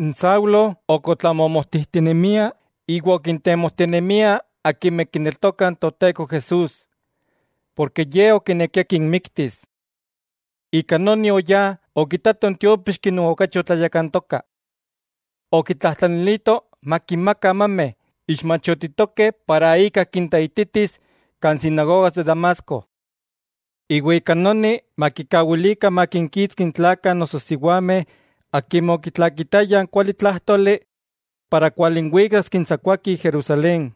Saulo ok otlamomojtijtinemia iwa okintemojtinemia akimeh kineltokah n Toteko Jesús, porke ye okinekia kinmiktis. Ika noni oyá okitato n tiópixki non okachi otlayakantoka, okitlajtlanilito makinmaka amameh ixmachotitokeh para ika kinteititis kan sinagogas de Damasco. Iwa ika noni makikawilikah makinkitski n tlakah noso siwameh akimeh okitlakitayah n kualitlájtoli para kualinwikas kintsakuaki Jerusalén.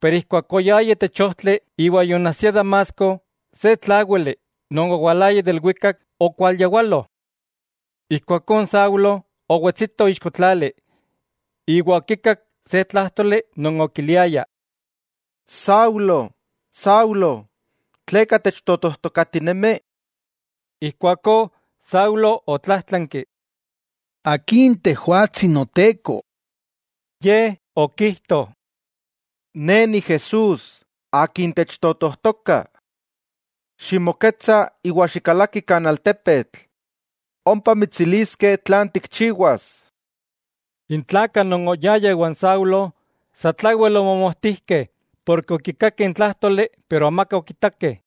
Pero ijkuak oyaya itech ojtli iwa yoonajsia Damasco, se tláwili non owalaya de ilwikak okualyawalo. Ijkuakó n Saulo owetsito ixko tlali, iwa okikak se tlájtoli non okiliaya: —Saulo, Saulo, ¿tleka techtotojtokatinemi? Ijkuakó Saulo otlájtlanki: —¿Akin tejwatsi Noteko? Ye okijto: —Ne Ni Jesús, tleka techtotojtoka. Ximoketsa iwa xikalaki kan altepetl. Ompa mitsiliskeh tlan tikchiwas. N tlakah non oyayah iwan Saulo, satlawel omomojtijkeh ken okikakeh n tlájtoli pero amaka okitakeh.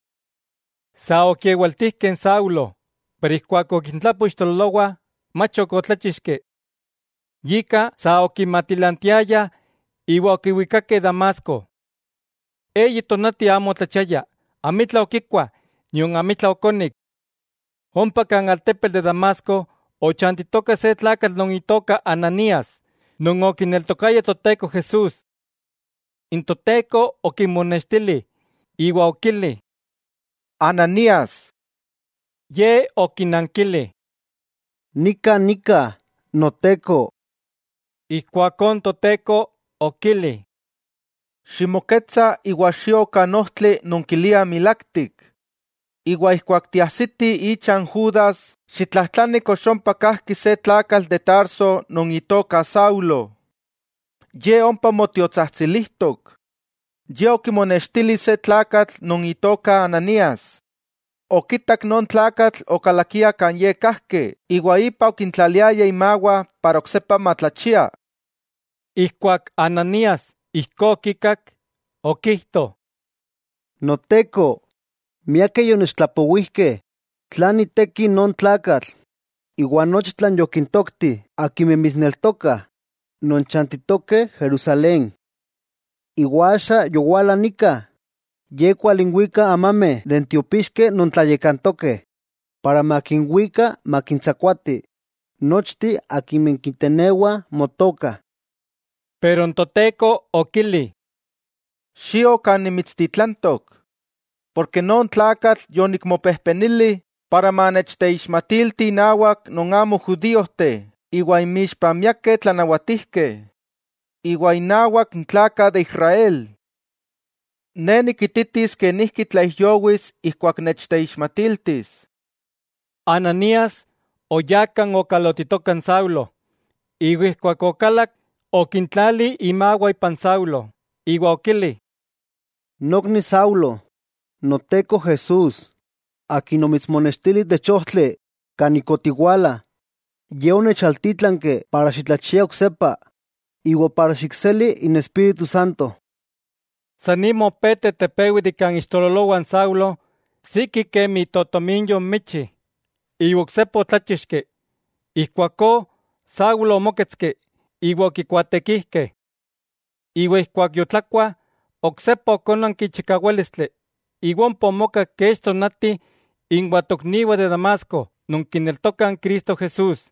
Sa okikewaltijkeh n Saulo, pero ijkuak okintlapo ixtololowah mach ok otláchixki. Yika, sa okimatilantiayah iwa okiwikakeh Damasco. Eyi tonati amo otlachiaya, amitla okikua nion amitla okonik. Ompa kan altepetl de Damasco ochantitoka se tlakatl non itoka Ananías non okineltokaya Toteko Jesús. N Toteko okimonextili iwa okili: —¡Ananías! Ye okinankili: —Nika nika, Noteko. Ijkuakó n Toteko okili: —Ximoketsa iwa xio kan ojtli non kiliah Milaktik, iwa ijkuak tiajsiti icha n Judas xitlajtlani kox ompa kajki se tlakatl de Tarso non itoka Saulo. Ye ompa motiotsajtsilijtok, ye okimonextili se tlakatl non itoka Ananías, okitak non tlakatl okalakia kan ye kajki iwa ipa okintlaliaya imawah para oksepa matlachia. Ijkuak Ananías ijkó okikak, okijto: —Noteko, miakeh yonechtlapowijkeh tlan iteki non tlakatl, iwa nochi tlan yokintokti akimeh mitsneltokah, non chantitokeh Jerusalén. Iwa axa yowala nika, ye kualinwika amameh de n tiopixkeh non tlayakantokeh para makinwika makintsakuati nochteh akimeh kitenewah Motoka. Pero n Toteko okili: —Xio kan nimitstitlantok, porke non tlakatl yonikmopejpenili para manechteixmatilti innawak non amo judíojteh iwa inmixpah miakeh tlanawatijkeh, iwa innawak n tlakah de Israel. Ne nikititis kenijki tlaijyowis ijkuak nechteixmatiltis. Ananías oyá kan okalotitoka n Saulo, iwa ijkuak okalak okintlali imawah ipan Saulo, iwa okili: —Nokni Saulo, Noteko Jesús, Akin omitsmonextili itech ojtli kan ik otiwalaya, Ye onechaltítlanki para xitlachia oksepa iwa xikseli n Espíritu Santo. San nima opé tetepewi de kan ixtololowah n Saulo siki kemi itotominyo n michi, iwa oksepa otláchixki. Ijkuakó Saulo omóketski iwa okikuaatekijkeh. Iwa ijkuak yotlakua, oksepa okónanki chikawálistli iwa ompa omoka kech tonati inwah tokniwah de Damasco non kineltokah n Cristo Jesús.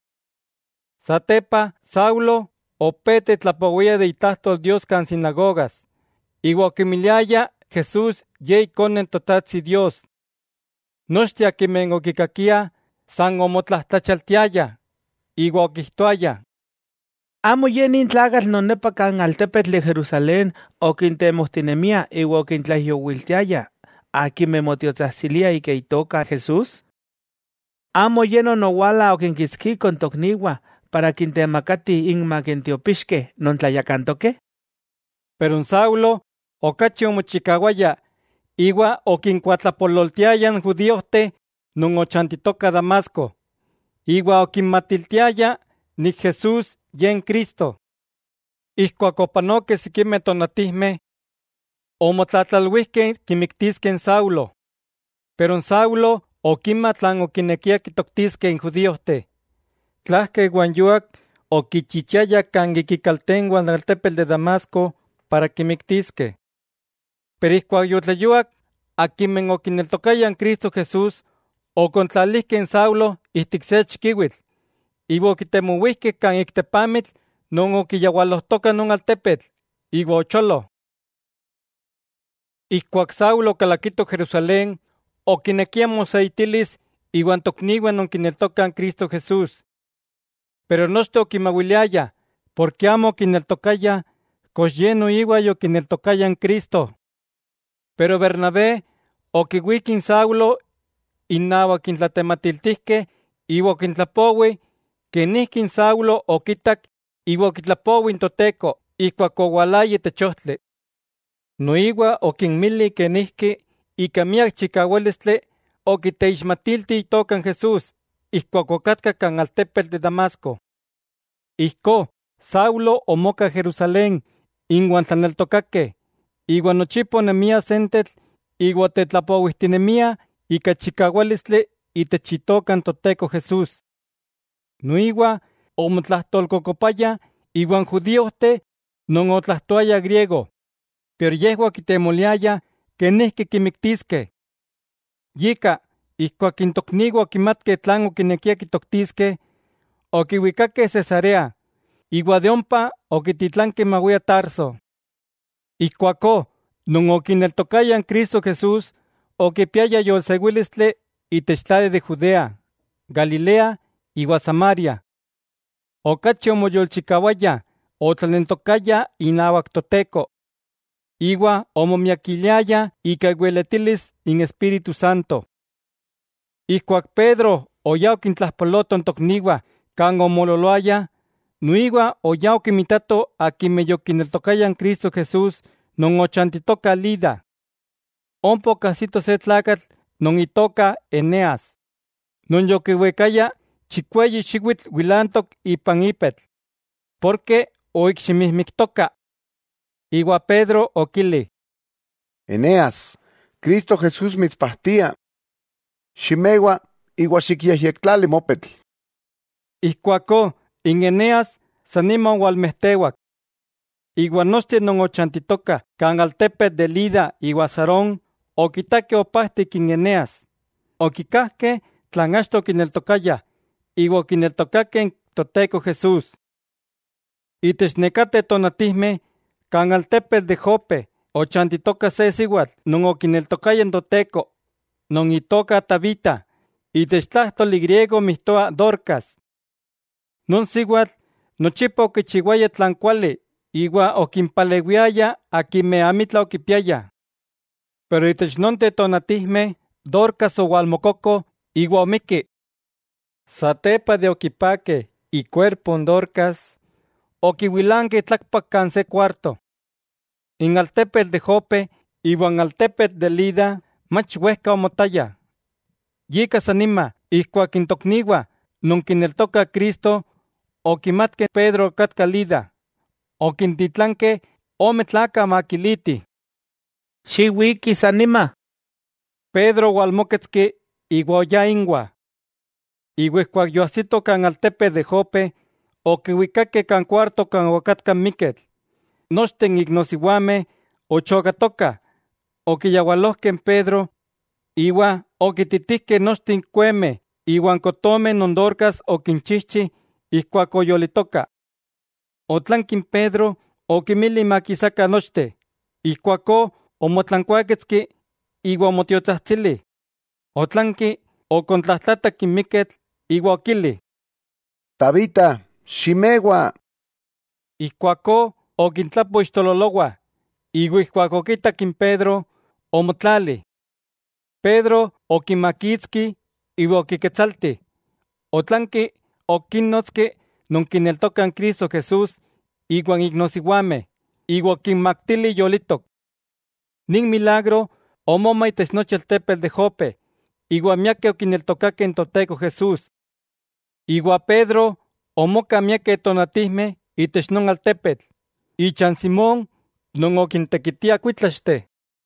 Satepa, Saulo opé tetlapowia de itlajtol Dios kan sinagogas, iwa okimiliaya Jesús Ye Ikone n Totajtsi Dios. Nochteh akimeh okikakiah san omotlajtlachialtiayah, iwa okijtoayah: —¿Amo ye nin tlakatl non nepa kan altepetl de Jerusalén okintemojtinemia iwa okintlaijyowiltiayah akimeh motiotsajtsiliah ika Itoka n Jesús? ¿Amo ye non owala okinkitskiko n tokniwah para kintemakatih inmak n tiopixkeh non tlayakantokeh? Pero n Saulo okachi omochikawaya iwa okinkuatlapololtiaya n judíojteh non ochantitokah Damasco, iwa okinmatiltiaya Jesús Ye n Cristo. Ijkuak opanokeh sikimeh tonatijmeh omotlatlalwijkeh kimiktiskeh n Saulo. Pero n Saulo okima tlan okinekiah kitoktiskeh n judíojteh. Tlajka iwa n yuak okichichiayah kan ik ikaltenwah n altepetl de Damasco para kimiktiskeh. Pero ijkuak yotleyuak, akimeh okineltokayah Cristo Jesús okontlalijkeh n Saulo ijtik se chikiwitl, iwa okitemowijkeh kan ik tepamitl non okiyawalojtoka non altepetl, iwa ocholo. Ijkuak Saulo okalakito Jerusalén, okinekia moseitilis iwa tokniwah non kineltokah Cristo Jesús. Pero nochteh okimawiliayah porke amo okineltokayah kox ye noiwa yokineltokaya n Cristo. Pero Bernabé okiwík n Saulo innawak n tlatematiltijkeh iwa okintlapowi kenijki n Saulo okitak iwa okitlapowi n Toteko ijkuak owalaya itech ojtli. Noiwa okinmili kenijki ika miak chikawálistli okiteixmatilti itoka n Jesús ijkuak okatka kan altepetl de Damasco. Ijkó Saulo omoka Jerusalén inwa n tlaneltokakeh, iwa nochipa onemia sentetl iwa otetlapowijtinemiah ika chikawálistli itech itoka n Toteko Jesús. Noiwa omotlajtolkokopaya iwan judíojteh non otlajtoayah griego, pero yejwah okitemoliayah kenijki kimiktiskeh. Yika, ijkuak n tokniwah okimatkeh tlan okinekiah kitoktiskeh, okiwikakeh Cesarea, iwa de ompa okititlankeh mawia Tarso. Ijkuakó non okineltokayah Cristo Jesús okipiayah yolsewílistli itech tlali de Judea, Galilea iwa Samaria. Okachi omoyolchikawayah otlaneltokayah inawak Toteko. Iwa omomiakiliayah ika iweletilis n Espíritu Santo. Ijkuak Pedro oyá okintlajpaloto n tokniwah kan omoololoayah, noiwa oyá okimitato akimeh yokineltokayah Cristo Jesús non ochantitokah Lida. Ompa okajsito se tlakatl non itoka Eneas, non yokiwikaya chikweyi xiwitl wilantok ipan ipetl, porke oikximijmiktoka. Iwa Pedro okili: —Eneas, Cristo Jesús mitspajtia. Ximewa iwa xikyejyektlali mopetl. Ijkuakó Eneas san nima owalmejtewak. Iwa nochteh non ochantitokah kan altepetl de Lida iwa Sarón okitakeh opajtik n Eneas, okikajkeh tlan achto okineltokayah iwa okineltokakeh n Toteko Jesús. Itech nekateh tonatijmeh kan altepetl de Jope ochantitoka se siwatl non okineltokaya n Toteko non itoka Tabita, itech tlájtoli griego mijtoa Dorcas. Non siwatl nochipa okichiwaya tlan kuali iwa okimpalewiaya akimeh amitla okipiayah. Pero itech nonteh tonatijmeh Dorcas owalmokoko iwa omikki. Satepa de okipakeh ikuerpo n Dorcas, okiwilankeh tlakpak kan se kuarto. N altepetl de Jope iwan altepetl de Lida mach wejka omotayah, yika san nima ijkuak n tokniwah non kineltokah Cristo okimatkeh Pedro okatka Lida, okintitlankeh ome tlakah makilitih: —Xiwiki san nima. Pedro omóketski iwa oyá inwah. Iwa ijkuak yoajsito kan altepetl de Jope, okiwikakeh kan kuarto kan okatka n miketl. Nochteh n iknosiwameh, ochokatokah okiyawalojkeh n Pedro iwa okiititijkeh nochteh n kuemeh iwa n kotomeh non Dorcas okinchijchi ijkuak oyolitoka. Otlanki n Pedro okinmili makisakah nochteh, ijkuakó omotlankuáketski iwa omotiotsajtsili; otlanki okontlajtlatak n miketl iwa okili: —¡Tabita, ximewa! Ijkuakó okintlapo ixtololowah, iwa ijkuak okitak n Pedro, omotlali. Pedro okimakitski iwa okiketsalti. Otlanki okínnotski non kineltokah Cristo Jesús iwa n iknosiwameh, iwa okinmaktili yolitok. Nin milagro omoma itech nochi altepetl de Jope, iwa miakeh okineltokakeh n Toteko Jesús. Iwa Pedro omoka miakeh tonatijmeh itech non altepetl, icha n Simón non okintekitia kuítlaxteh.